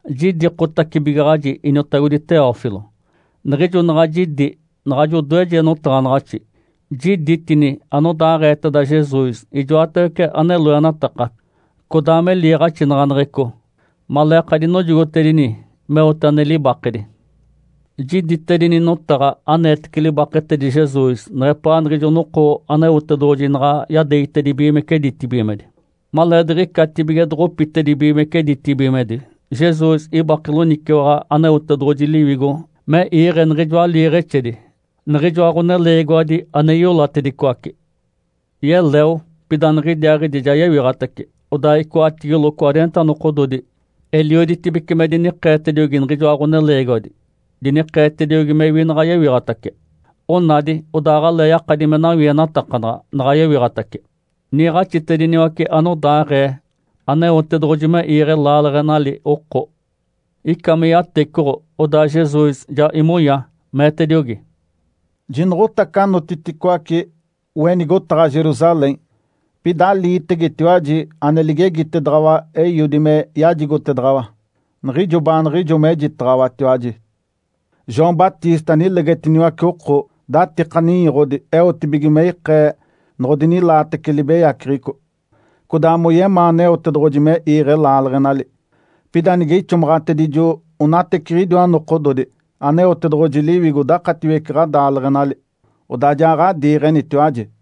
Jidikotacibigaɡ̶aji, iniotagodi Teófilo. Niɡ̶ijo naɡ̶a jidi naɡ̶ajo odoeje notaɡ̶anaɡ̶axi, jiditini anodaaɡ̶eeteda Jesus, ijoatawece ane loenataka codaa me liiɡ̶axinaɡ̶aneɡ̶eco maleeka dinojogotedini meote ane libakedi. Jiditedini notaɡ̶a aneetece libaketedi Jesus neɡ̶epaa niɡ̶ijo noko Aneotedoɡ̶oji naɡ̶a yadeegitedibigimece ditibigimedi. Maleediɡ̶icatibige doɡ̶opitedibigimece ditibigimedi Jesus ibake loniciwaɡ̶a Aneotedoɡ̶oji Liwigo me iiɡ̶e niɡ̶ijoa liiɡ̶exedi, niɡ̶ijoa ɡ̶oneleegiwadi ane iolatedicoace. Yeleo pida niɡ̶idiaaɡ̶idi ja yewiɡ̶atace, odaa icoatigilo cwareenta nokododi elioditibece me dinikeetediogi niɡ̶ijoa ɡ̶oneleegiwadi, dinikeetediogi mewi naɡ̶a yewiɡ̶atace. Onadi odaa aɡ̶alee yakadi me nawienatakanaɡ̶a naɡ̶a yewiɡ̶atace. Niiɡ̶axitediniwace anodaaɡ̶ee Aneotedoɡ̶oji me iiɡ̶e laaleɡ̶enali oko. Ica me yatecoɡ̶o, odaa Jesus ja imonya, meetediogi, “Jinoɡ̶otace anotiticoace we nigotaɡ̶a Jerusalém, pida aliitegetiwaji ane ligegitedaɡ̶awa Eiodi me yajigotedaɡ̶awa, niɡ̶ijo baaniɡ̶ijo mejitaɡ̶awatiwaji. João Batista nilegetiniwace oko datika ninyoɡ̶odi eotibige me ikee noɡ̶odinilaatece libeyaceɡ̶eco, codaa moyemaa Aneotedoɡ̶oji me iiɡ̶e laaleɡ̶enali. Pida nige ixomaɡ̶atedijo onateciɡ̶idiwa nokododi Aneotedoɡ̶oji Liwigo dakatiwece ɡ̶adaaleɡ̶enali, odaa ja ɡ̶adiiɡ̶enitiwaji.”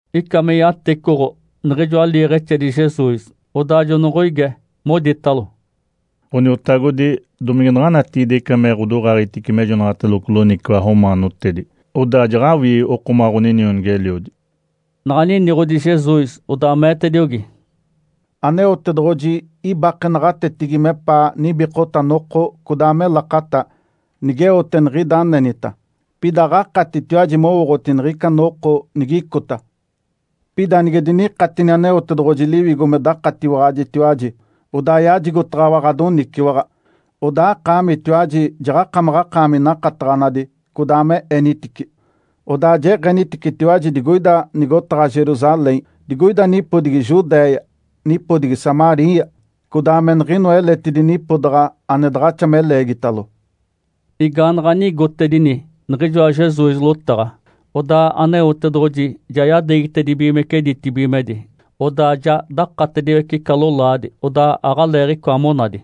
Ica me yatecoɡ̶o niɡ̶ijoa liiɡ̶exedi Jesus, odaa jonoɡ̶oige, moditalo, “Ǥoniotagodi, domige naɡ̶a natigide ica me ɡ̶odoɡ̶aaɡ̶egitice mejonaɡ̶ateloco loniciwaɡ̶a romaanotedi, odaa jaɡ̶awii okomaɡ̶a ɡ̶oninionigi-eliodi?” Naɡ̶a niniɡ̶odi Jesus, odaa meetediogi, “Aneotedoɡ̶oji ibake naɡ̶atetigi mepaa nibikota noko codaa me lakata nigeote niɡ̶ida anenita, pida aɡ̶akatitiwaji mowooɡ̶oti niɡ̶ica noko nigicota. Pida nige dinikatini Aneotedoɡ̶oji Liwigo me dakatiwaɡ̶ajitiwaji, odaa yajigotaɡ̶awa ɡ̶adoniciwaɡ̶a. Odaa akaamitiwaji jaɡ̶akamaɡ̶akaami nakataɡ̶anadi codaa me enitici. Odaa jeɡ̶eniticitiwaji digoina nigotaɡ̶a Jerusalém, digoida nipodigi Judéia, nipodigi Samaria, codaa me niɡ̶inoa eletidi nipodaɡ̶a ane daɡ̶axa me leegitalo.” Igaanaɡ̶a nigotedini niɡ̶ijoa Jesus lotaɡ̶a, odaa Aneotedoɡ̶oji ja yadeegitedibigimece ditibigimedi. Odaa ja dakatediwece ica lolaadi, odaa aɡ̶aleeɡ̶icoa monadi.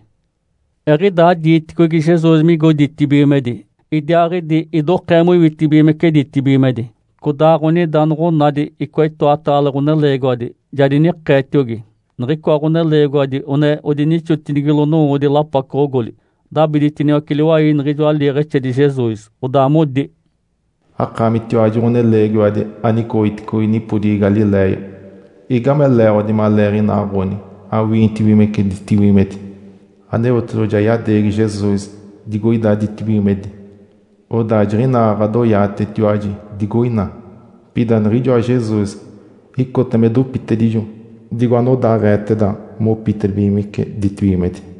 Eɡ̶idaa diiticogi Jesus migo ditibigimedi, idiaaɡ̶idi idokee moiwitibigimece ditibigimedi, codaaɡ̶onida noɡ̶onadi icoa itoataale ɡ̶oneleegiwadi ja dinikeetiogi. Niɡ̶icoa ɡ̶oneleegiwadi one odinixotinigilo nowoodi lapacoɡ̶ogoli, dabiditiniwace liwai niɡ̶ijoa liiɡ̶exedi Jesus. Odaa modi, “Akaamitiwaji, ɡ̶oneleegiwadi anicoɡ̶oticogi nipodigi Galiléia, igame leeɡ̶odi maleeɡ̶inaaɡ̶oni awinitibigimece ditibigimedi? Aneotedoɡ̶oji ja yadeegi Jesus digoida ditibigimedi, odaa jiɡ̶inaa ɡ̶adoyaatetiwaji digoina. Pida niɡ̶ijoa Jesus icota me dopitedijo digo anodaaɡ̶eeteda mopitedibigimece ditibigimedi.”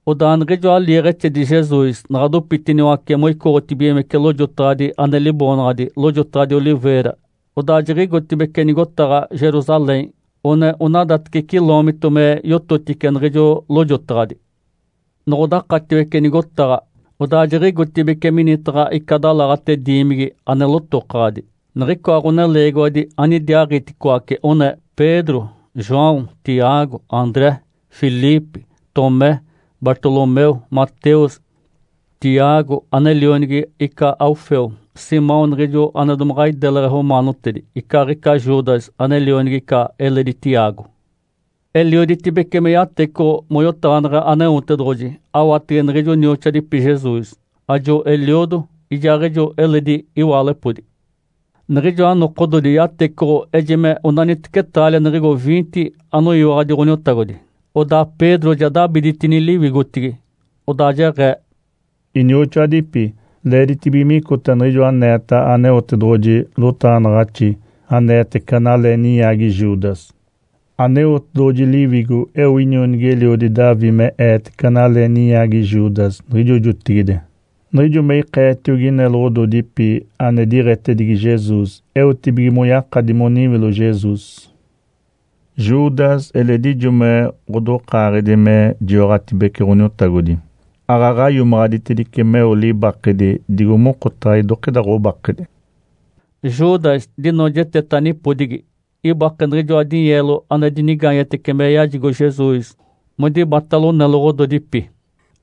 Odaa niɡ̶ijoa liiɡ̶exedi Jesus naɡ̶a dopitiniwace moicoɡ̶otibigimece lojotaɡ̶adi ane liboonaɡ̶adi “Lojotaɡ̶adi Oliveira”, odaa jiɡ̶igotibeci nigotaɡ̶a Jerusalém one onadateci ciloomito me yototice niɡ̶ijo lojotaɡ̶adi. Noɡ̶odakatiwece nigotaɡ̶a, odaa jiɡ̶igotibeci minitaɡ̶a ica dalaɡ̶ate diimigi ane lotokaɡ̶adi. Niɡ̶icoa ɡ̶oneleegiwadi anidiaaɡ̶iticoace one: Pedro, João, Tiago, André, Filipe, Tomé, Bartolomeu, Mateus, Tiago ane lionigi ica Alfeu, Simão niɡ̶ijo ane domaɡ̶a ideleɡ̶e romaanotedi, icaaɡ̶ica Judas ane lionigi ica eledi Tiago. Elioditibece me yatecoɡ̶o moyotaɡ̶aneɡ̶e Aneotedoɡ̶oji awatege niɡ̶ijo nioxoadipi Jesus, ajo eliodo, ijaaɡ̶ijo eledi iwaalepodi. Niɡ̶ijoa nokododi yatecoɡ̶o ejime onaniteci taalia niɡ̶igo viinte anoyiwaɡ̶adi Ǥoniotagodi. Odaa Pedro ja dabiditini liwigotigi, odaa jeɡ̶ee, “Inioxoadipi, leeditibige micota niɡ̶ijo aneeta Aneotedoɡ̶oji lotaɡ̶anaɡ̶axi aneetece analee ninyaagi Judas. Aneotedoɡ̶oji Liwigo eo inionigi-eliodi Davi me eetece analee ninyaagi Judas niɡ̶ijo jotigide. Niɡ̶ijo me ikeetiogi neloɡ̶ododipi ane diɡ̶etedigi Jesus eotibige moyakadi moniwilo Jesus. Judas eledi ijo me ɡ̶odokaaɡ̶edi me jiwaɡ̶atibece Ǥoniotagodi, aaɡ̶aɡ̶a iomaɡ̶aditedice meo libakedi digo mokotaɡ̶a idokida ɡ̶obakedi.” Judas dinoojeteta nipodigi. Ibake niɡ̶ijoa dinyeelo ane dinigaanyetece me yajigo Jesus modibatalo neloɡ̶ododipi.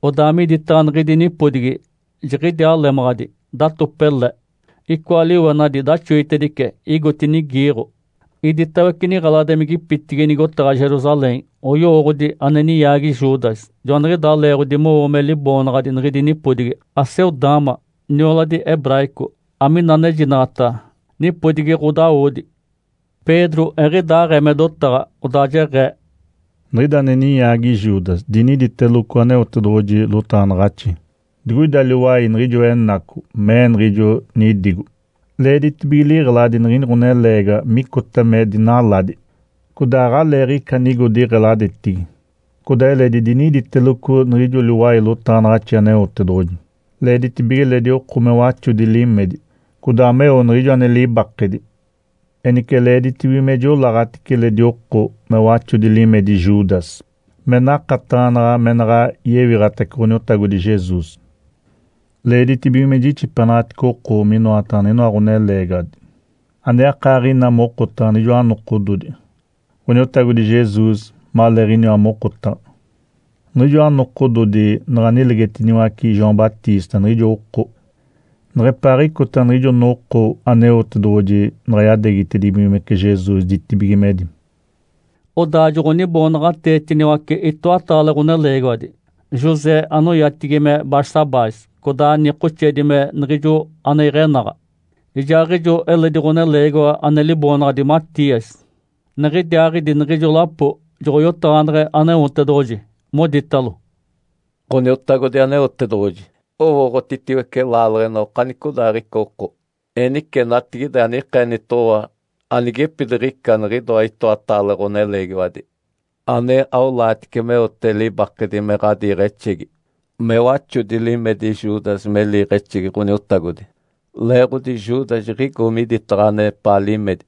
Odaa miditaɡ̶a niɡ̶idi nipodigi, jiɡ̶idiaa lemaɡ̶adi, datope le, icoa liwenadi daxoitedice igotinigi iiɡ̶o. Iditawece niɡ̶eladimigipitigi nigotaɡ̶a Jerusalém oyowooɡ̶odi ane ninyaagi Judas. Joaniɡ̶idaa leeɡ̶odi mowo me liboonaɡ̶adi niɡ̶idi nipodigi, “Aceldama”, nioladi hebraico, amina anejinaɡ̶ata “Nipodigi ɡ̶odawodi”. Pedro eɡ̶idaaɡ̶ee me dotaɡ̶a, odaa jeɡ̶ee, “Niɡ̶ida ane ninyaagi Judas diniditeloco Aneotedoɡ̶oji lotaɡ̶anaɡ̶axi, digoida liwai niɡ̶ijoa enaco, mee niɡ̶ijo nidigo, ‘Leeditibige liɡ̶eladi niɡ̶ini ɡ̶oneleegiwa micota me dinaladi, codaa aɡ̶aleeɡ̶ica anigo diɡ̶eladetigi.’ Codaa eledi diniditeloco niɡ̶ijo liwai lotaɡ̶anaɡ̶axi Aneotedoɡ̶oji, ‘Leeditibige eledi oko me waxodi limedi, codaa meo niɡ̶ijo ane libakedi.’ Enice leeditibige me jiolaaɡ̶atice eledi oko me waxodi limedi Judas me nakataɡ̶anaɡ̶a me naɡ̶a yewiɡ̶atace Ǥoniotagodi Jesus. Leeditibige me jixipenaɡ̶atice oko minoataɡ̶a niɡ̶inoa ɡ̶oneleegiwadi ane akaaɡ̶ina mokotaɡ̶a niɡ̶ijoa nokododi Ǥoniotagodi Jesus maleeɡ̶iniwa mokotaɡ̶a, niɡ̶ijoa nokododi naɡ̶a nilegetiniwace João Batista niɡ̶ijo oko, neɡ̶epaaɡ̶icota niɡ̶ijo noko Aneotedoɡ̶oji naɡ̶a yadeegitedibigimece Jesus ditibigimedi.” Odaa joɡ̶oniboonaɡ̶ateetiniwace itoataale ɡ̶oneleegiwadi, José anoyatigi me Barsabás, codaa nikoxeedi me “Niɡ̶ijo ane iɡ̶enaɡ̶a”, ijaaɡ̶ijo eledi ɡ̶oneleegiwa ane liboonaɡ̶adi Matias. Niɡ̶idiaaɡ̶idi niɡ̶ijo lapo joɡ̶oyotaɡ̶aneɡ̶e Aneotedoɡ̶oji, moditalo, “Ǥoniotagodi Aneotedoɡ̶oji, owooɡ̶otitiwece laaleɡ̶ena okanicodaaɡ̶ica oko. Enice natigide anikeenitoɡ̶owa anigepidiɡ̶ica niɡ̶idoa itoataale ɡ̶oneleegiwadi ane aolaatice meote libakedi me ɡ̶adiiɡ̶exegi, me waxodi limedi Judas me liiɡ̶exegi Ǥoniotagodi, leeɡ̶odi Judas jiɡ̶igo miditaɡ̶a anepaa limedi.”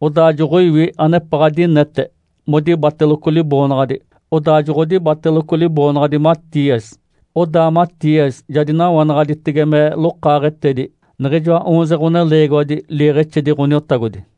Odaa joɡ̶oiwi anepaɡ̶a dinete modibateloco liboonaɡ̶adi, odaa joɡ̶odibateloco liboonaɡ̶adi Matias. Odaa Matias ja dinawanaɡ̶aditege me lokaaɡ̶etedi niɡ̶ijoa oonze ɡ̶oneleegiwadi liiɡ̶exedi Ǥoniotagodi.